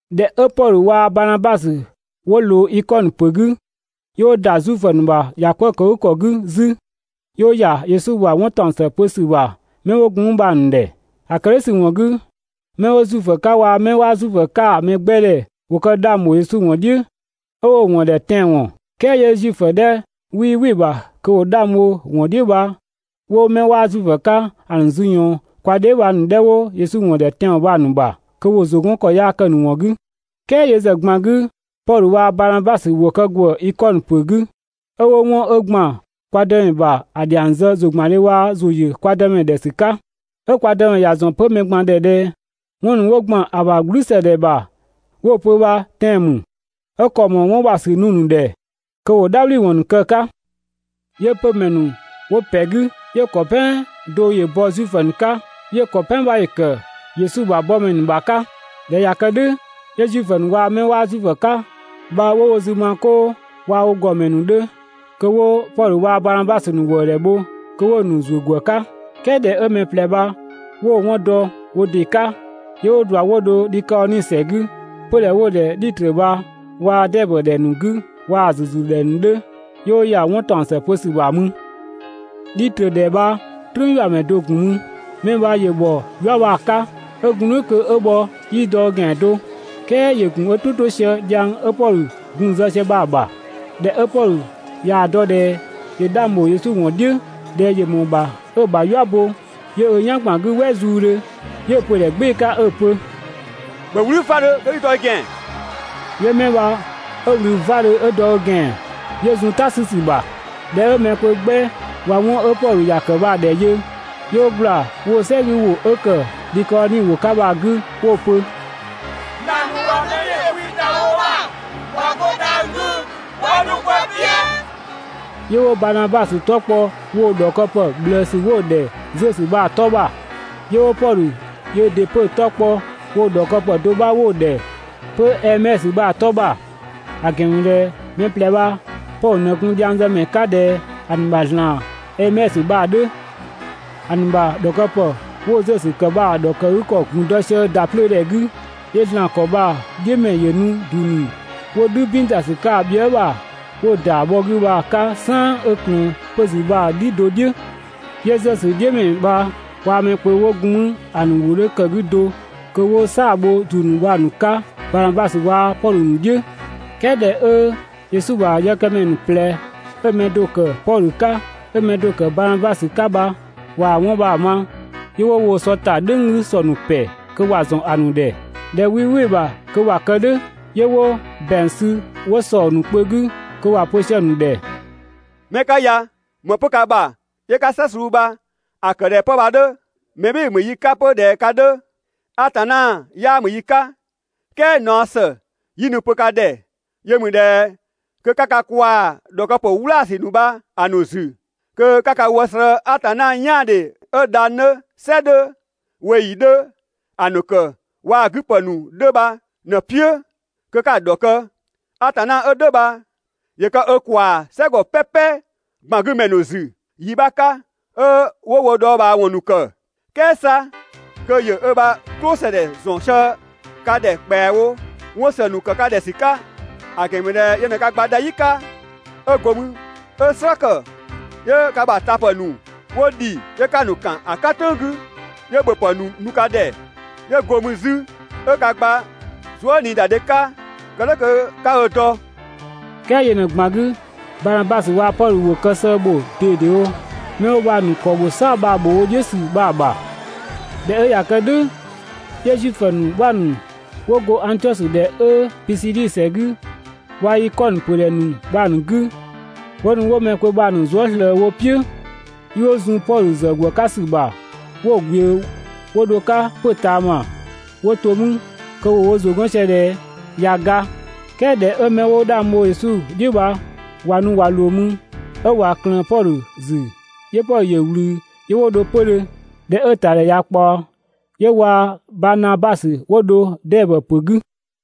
꞊Dhɛ 'ö Pɔdhö waa‑ Banabasö 'wo ꞊loo Ikɔnö ‑pö 'gü, 'yö 'wo ‑da Zuifö ‑nu ‑bha ‑yakwëëkëgükɔ 'gü 'zü, 'yö 'wo ‑ya Yesu ‑bha 'wɔn ‑taɔng ‑së pö ‑sü ‑bha 'mɛ 'wo gun mü bha‑ ‑nu ‑dhɛ. ‑A ‑kë "dhʋ̈ ‑sü ‑wɔn 'gü, 'mɛ 'wo Zuifö 'ka waa‑ 'mɛ 'waa Zuifö 'ka‑ mɛ 'gbɛ ‑wo kë 'dhang ‑bho Yesu ‑wɔn "dhiʋ̈ 'ö 'wo‑ ‑wɔn ‑dhɛ tɛanwɔn. "Kɛɛ 'yö Zuifö 'dhɛ 'wii "wɩ‑ ‑bha kö ‑wo 'dhang bho 'wɔn "dhiʋ̈ bha, 'wo 'mɛ 'waa Zuifö 'ka ‑a ‑nu ‑zü ‑yɔɔn kwa dheebhang 'dhɛ ‑nu 'wo Yesu ‑wɔn ‑dhɛ tɛanwɔn bha‑ ‑nu ‑bha kö ‑wo ‑zʋ 'gɔn ‑kɔ yaa kë‑ ‑nu ‑wɔn 'gü. "Kɛɛ yö ‑zë ꞊gban 'gü Pɔdhö waa‑ Banabasö ‑wo kë ‑gwëë Ikɔnö ‑pö 'gü 'ö 'wo 'wɔn 'ö ‑gban kwa Dëmɛ ‑bha ‑a ‑dhiang zë ‑zʋgbandhe waa‑ ‑zʋ ‑yö kwa Dëmɛ ‑dhɛ ‑sü 'ka, 'ö kwa Dëmɛ ‑ya ‑zɔn 'pö mɛ ꞊gban ‑dhɛ ꞊dhɛ 'wɔn ‑nu 'wo ‑gban ‑a ‑bha "gblüsëdhɛ ‑bha 'wo‑ pö bha tɛan‑ ‑mü, 'ö ‑kɔ ‑mɔɔ 'wɔn ‑bha ‑sü nu‑ ‑nu ‑dhɛ kö ‑wo "dhabhliwɔn ‑nu kë‑ 'ka. 'Yö 'pömɛ ‑nu 'wo ‑pɛ 'gü, 'yö‑ mɛ ‑kɔ "pɛan do ‑yö bɔ Zuifö ‑nu 'ka, 'yö‑ ‑kɔ "pɛan 'bha ‑yö ‑kë Yesu ‑bha yëkëmɛ ‑nu ‑bha 'ka. ꞊Dhɛ 'ö ꞊ya kë "dhʋ̈ 'yö Zuifö ‑nu waa‑ 'mɛ 'waa Zuifö 'ka bha 'wo wo zü ma 'koo waa‑ wo ‑gɔdhiʋ̈mɛ ‑nu 'dhö kö 'wo Pɔdhö waa‑ Banabasö ‑nu ‑wëëdhɛ bho kö 'wo‑ ‑nu ‑zuö ‑gwë 'ka. "Kɛɛ ꞊dhɛ 'ö mɛ ꞊plɛ bha 'wo‑ 'wɔn dɔ, wo ‑dɩ 'ka, 'yö 'wo ꞊dua 'wo dho Dhikaoni ‑sɛ 'gü, 'pödhɛ 'wo‑ ‑dhɛ Dhitrö bha waa‑ Dɛɛbö ‑dhɛ ‑nu 'gü waa‑ ‑nu ‑züzü ‑dhɛ ‑nu 'dhö, 'yö 'wo ‑ya 'wɔn ‑taɔng ‑së pö ‑sü ‑bha mü. Dhitrö ‑dhɛ bha "trüünyuamɛ do‑ ‑gun mü. 'Mɛ bha ‑yö ‑bhɔ "yua bha‑ 'ka, 'ö gun "dhʋ̈ kö 'ö bhɔ 'yii dɔ ö ‑gɛan do. "Kɛɛ ‑yö ‑gun ö "tʋ 'to sië dhiang 'ö Pɔdhö gun‑ zë sië bha‑ ‑bha. ꞊Dhɛ 'ö Pɔdhö ꞊yaa‑ dɔ ꞊dhɛ ‑yö 'dhang ‑bho Yesu ‑wɔn "dhiʋ̈, ꞊dhɛ ‑yö ‑mɔɔ ‑bha 'ö‑ ‑bha "yua bo, 'yö ö "yan ‑gban 'gü "wɛ zuudhö, 'yö‑ pö‑ ‑dhɛ "gbɩɩ‑ 'ka 'ö‑ pö: «‑Bhö "wlü 'vadhö kö 'i dɔ i ‑gɛan!» 'Yö 'mɛ bha 'ö ꞊wlü 'vadhö 'yö dɔ ö ‑gɛan 'yö zun "ta 'sü ‑sü ‑bha. ꞊Dhɛ 'ö mɛ kpö 'gbɛ ꞊wa 'wɔn 'ö Pɔdhö ‑ya ‑kë bha‑ ‑dhɛ yö, 'yö 'wo ꞊gbla woo‑ "sɛ 'gü ‑wʋ 'ö ‑kë Dhikaoni ‑wʋ 'ka bha‑ 'gü 'wo‑ pö: «‑Zlan ‑nu ꞊wa mɛbhɩɩdhe kwi ‑da wo ‑bha ꞊wa 'go dhang‑ 'gü ꞊wa nu kwa "piʋ̈!» 'Yö 'wo Banabasö 'tɔ kpɔ woo‑ ‑dhɔkëpë ꞊bhlëësü 'wo‑ ‑dhɛ Zösö bha‑ 'tɔ bha, 'yö 'wo Pɔdhö yöö ‑dɩ 'pö‑ 'tɔ kpɔ woo‑ ‑dhɔkëpë do 'bha 'wo‑ ‑dhɛ 'pö Ɛɛmɛsö bha‑ 'tɔ ‑bha; ‑a ‑gɛn ‑mü ꞊dhɛ mɛ ꞊plɛ bha Pɔdhö ꞊në gun dhiangzëmɛ 'ka ꞊dhɛ ‑a ‑nu ‑bha ‑zlan Ɛɛmɛsö bha‑ 'dhö. ‑A ‑nu ‑bha ‑dhɔkëpë 'wo‑ Zösö ‑kë bha‑ ‑dhɔkëgükɔ ‑gun dɔ sië ‑da 'plöö ‑dhɛ 'gü. 'Yö ‑zlan ‑kɔ bha‑ "dhiʋ̈mɛ ‑yö nu ‑du ‑nu 'wo "dhü "bin ta ‑sü 'ka bhië" ‑bha, 'wo‑ ‑da ‑nu bhɔ 'gü bha‑ 'ka "saan 'ö ꞊klëën 'pö‑ ‑zü bha‑ "dhi do "dhiʋ̈. 'Yö Zösö "dhiʋ̈mɛ bha waa‑ mɛ kpö 'wo gun 'mü ‑a ‑nu ‑wʋ 'dhö ‑kë 'gü do kö 'wo "saa‑ bho ‑du ‑nu bha‑ nu‑ 'ka Banabasö waa‑ Pɔdhö ‑nu "dhiʋ̈. "Kɛɛ ꞊dhɛ 'ö Yesu ‑bha yëkëmɛ ‑nu ꞊plɛ 'ö‑ 'mɛ do‑ ‑kë Pɔdhö 'ka 'ö‑ mɛ do‑ ‑kë Baanabasö 'ka bha ꞊wa 'wɔn bha‑ ma, 'yö 'wo woo‑ sɔ ‑ta "dhʋ̈ng 'gü ‑sɔ ‑nu ‑pɛ, (kö ‑wa ‑zɔn ‑a ‑nu ‑dhɛ ꞊dhɛ 'wii "wɩ‑ ‑bha kö ‑wa kë "dhʋ̈). 'Yö 'wo ‑bɛang sü 'wo ‑sɔ ‑nu kpö 'gü kö ‑wa pö sië‑ ‑nu ‑dhɛ: «'Mɛ 'ka ya, ‑më 'pö ka ‑bha 'yö 'ka "slë suu bha‑ ‑kë ꞊dhɛ 'pë bha‑ 'dhö? Mɛ "bhɩɩ‑ ‑mü yi 'ka 'pö ꞊dhɛ ka 'dhö, Atanna 'yaa ‑mü yi 'ka, "kɛɛ naɔ ‑së 'yi nu‑ pö ka ‑dhɛ yö ‑mü ꞊dhɛ kö 'ka ka kwaa‑ ‑dhɔkëpë "wlaasü ‑nu bha‑ ‑nu ‑zü kö 'ka ka wë slëë‑ Atanna "yaandhe 'ö dhang‑ 'dhö, "sɛ 'dhö, ꞊weeyi 'dhö ‑a ‑nu ‑kë waa‑ ‑nu 'gü ‑pë ‑nu 'dhö bha ꞊në‑ "piʋ̈ kö 'ka‑ ‑dhɔkë! Atanna 'ö "dhʋ̈ bha ‑yö kë ö ‑kwaa "sɛgɔ "pɛpɛ ꞊gban 'gü ‑mɛ ‑nu ‑zü yi 'bha 'ka 'ö 'wo wo dhɔɔbhaawɔn ‑nu ‑kë. "Kɛɛ 'sa kö ‑yö ö ‑bha "klʋsëdhɛ ‑zɔn sië ka ‑dhɛ ‑kpɛawo 'wɔn ‑së ‑nu ‑kë ka ‑dhɛ ‑sü 'ka, ‑a ‑gɛn ‑mü ꞊dhɛ yö ꞊në ka gba dha "yi 'ka, 'ö go mü 'ö‑ "slë ‑kë 'yö ka ‑bha tapë ‑nu 'wo ‑dhi 'yö 'ka‑ ‑nu ‑kan ‑a "kan "tʋ̈ng 'gü, 'yö ‑bhöpë ‑nu nu ka ‑dhɛ, 'yö go mü 'zü 'ö ka gba zuëniidadhe 'ka kë "dhʋ̈ kö 'ka ö dɔ.» "Kɛɛ yö ꞊në‑ ꞊gban 'gü, Banabasö waa‑ Pɔdhö ‑wo kë sëë ‑bho ꞊dedewo 'mɛ 'wo bha‑ ‑nu ‑kɔ ‑bho "saa‑ bha ‑bho wo "dhiʋ̈ ‑sü bha‑ ‑bha. ꞊Dhɛ 'ö ꞊ya kë "dhʋ̈, 'yö Zuifö ‑nu 'bha ‑nu ‑wo ‑go Angtiɔsö ‑dhɛ 'ö Pisidi ‑sɛ 'gü waa‑ Ikɔnö ‑pödhɛ ‑nu bha‑ ‑nu 'gü, 'wo nu 'wo mɛ kpö bha‑ ‑nu zuë" ‑slëë wo "piʋ̈. 'Yö 'wo zun Pɔdhö ‑zë ‑gwë 'ka ‑sü ‑bha 'wo‑ ꞊gbiʋ̈ 'wo dho‑ 'ka 'pö‑ ꞊taama 'wo‑ to mü kö ‑wo wo ‑zʋ 'gɔn sië ꞊dhɛ ꞊ya ga. "Kɛɛ ꞊dhɛ 'ö 'mɛ 'wo 'dhang bho Yesu "dhiʋ̈ bha ꞊wa nu ꞊wa ꞊loo mü, 'ö ꞊wa ꞊klëën Pɔdhö ‑zü, 'yö Pɔdhö ‑yö ꞊wlü 'yö 'wo dho 'pödhö. ꞊Dhɛ 'ö‑ ‑tadhɛ ꞊ya ꞊kpaɔ, 'yö waa‑ Banabasö 'wo dho Dɛɛbö ‑pö 'gü.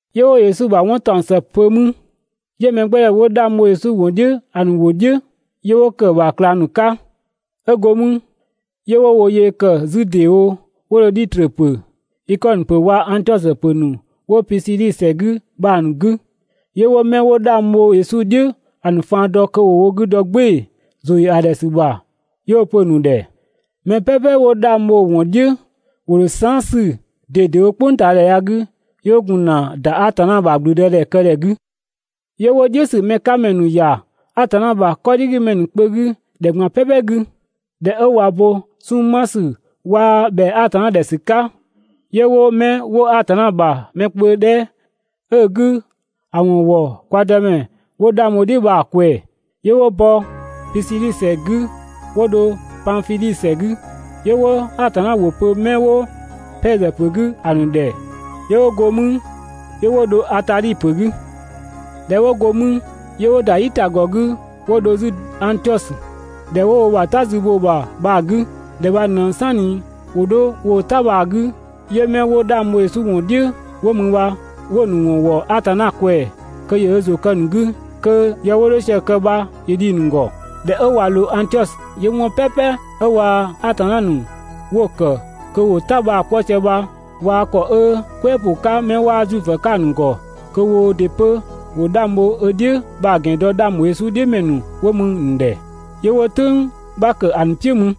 'Yö 'wo Yesu ‑bha 'wɔn ‑taɔng ‑së pö mü. 'Yö mɛgbɛdhɛ 'wo 'dhang bho Yesu ‑wɔn "dhiʋ̈ ‑a ‑nu ‑wʋ "dhiʋ̈ 'yö 'wo ‑kë ‑bha ꞊klang ‑nu 'ka. 'Ö go 'mü 'yö 'wo wo yee ‑kë 'zü ‑deewo 'wo dho Dhitrö ‑pö, Ikɔnö ‑pö waa‑ Angtiɔsö ‑pö ‑nu 'wo Pisidi ‑sɛ 'gü bha‑ ‑nu 'gü. 'Yö 'wo 'mɛ 'wo 'dhang bho Yesu "dhiʋ̈ ‑a ‑nu faan dɔ kö ‑wo wo 'gü dɔ "gbɩɩ‑ ‑zʋ ‑yö ‑a ‑dhɛ ‑sü ‑bha 'yö 'wo‑ pö‑ ‑nu ‑dhɛ: «Mɛ "pɛpɛ 'wo 'dhang bho‑ ‑wɔn "dhiʋ̈ ‑wo ‑dho saan" 'sü ꞊dedewo "kpʋngtaadhɛ ya‑ 'gü, 'yö 'wo gun ‑na ‑da Atanna ‑bha ‑gblüdëdhɛkëdhɛ 'gü. 'Yö 'wo "dhiʋ̈ ‑sü mɛ 'ka ‑mɛ ‑nu ‑ya Atanna ‑bha 'kɔdhigümɛ kpö 'gü ‑dhɛ ꞊gban "pɛpɛ 'gü. ꞊Dhɛ 'ö ꞊wa bo 'sunng‑ 'ma ‑sü waa‑ ‑bhɛa Atanna ‑dhɛ ‑sü 'ka, 'yö 'wo 'mɛ 'wo Atanna ‑bha mɛ kpö 'dhɛ 'ö‑ 'gü ‑a ‑wɔn ‑wɔ kwa Dëmɛ 'wo 'dhang bho‑ "dhiʋ̈ bha‑ ꞊kwɛɛ‑. 'Yö 'wo bɔ Pisidi ‑sɛ 'gü 'wo dho Panfidhi ‑sɛ 'gü, 'yö 'wo Atanna ‑wʋ pö 'mɛ 'wo Pɛɛzö ‑pö 'gü ‑a ‑nu ‑dhɛ. 'Yö go mü 'yö 'wo dho Atadhi ‑pö 'gü. ꞊Dhɛ 'wo go 'mü, 'yö 'wo ‑da "yitagɔ 'gü 'wo dho 'zü Angtiɔsö, ‑dhɛ do 'wo wo ‑bha "ta zü bho‑ ‑bha bha‑ 'gü. ‑Dhɛ bha ꞊në "sanni ‑wo 'dho woo‑ "ta bha‑ 'gü, 'yö 'mɛ 'wo 'dhang bho Yesu ‑wɔn "dhiʋ̈ 'wo mü bha 'wo‑ ‑nu ‑wɔn ‑wɔ Atanna ꞊kwɛɛ‑ kö ‑yö ö ‑zʋ kë‑ ‑nu 'gü kö yë 'wo 'dho sië‑ kë bha ‑yö dhi‑ ‑nu ‑gɔ. ꞊Dhɛ 'ö ꞊wa ꞊loo Angtiɔsö, 'yö 'wɔn "pɛpɛ 'ö waa‑ Atanna ‑nu 'wo‑ ‑kë kö ‑wo "ta bha‑ 'kpɔ sië bha, ꞊waa‑ ‑kɔ 'ö "kwɛɛ ‑pʋ 'ka 'mɛ 'waa Zuifö 'ka‑ ‑nu ‑gɔ kö woo ‑dɩ 'pö ‑wo 'dhang bho ö "dhiʋ̈ bha‑ ‑gɛn dɔ 'dhang ‑bho Yesu "dhiʋ̈ ‑mɛ ‑nu 'wo mü‑ ‑nu ‑dhɛ. 'Yö 'wo "tʋ̈ng 'bha ‑kë ‑a ‑nu "piʋ̈ mü.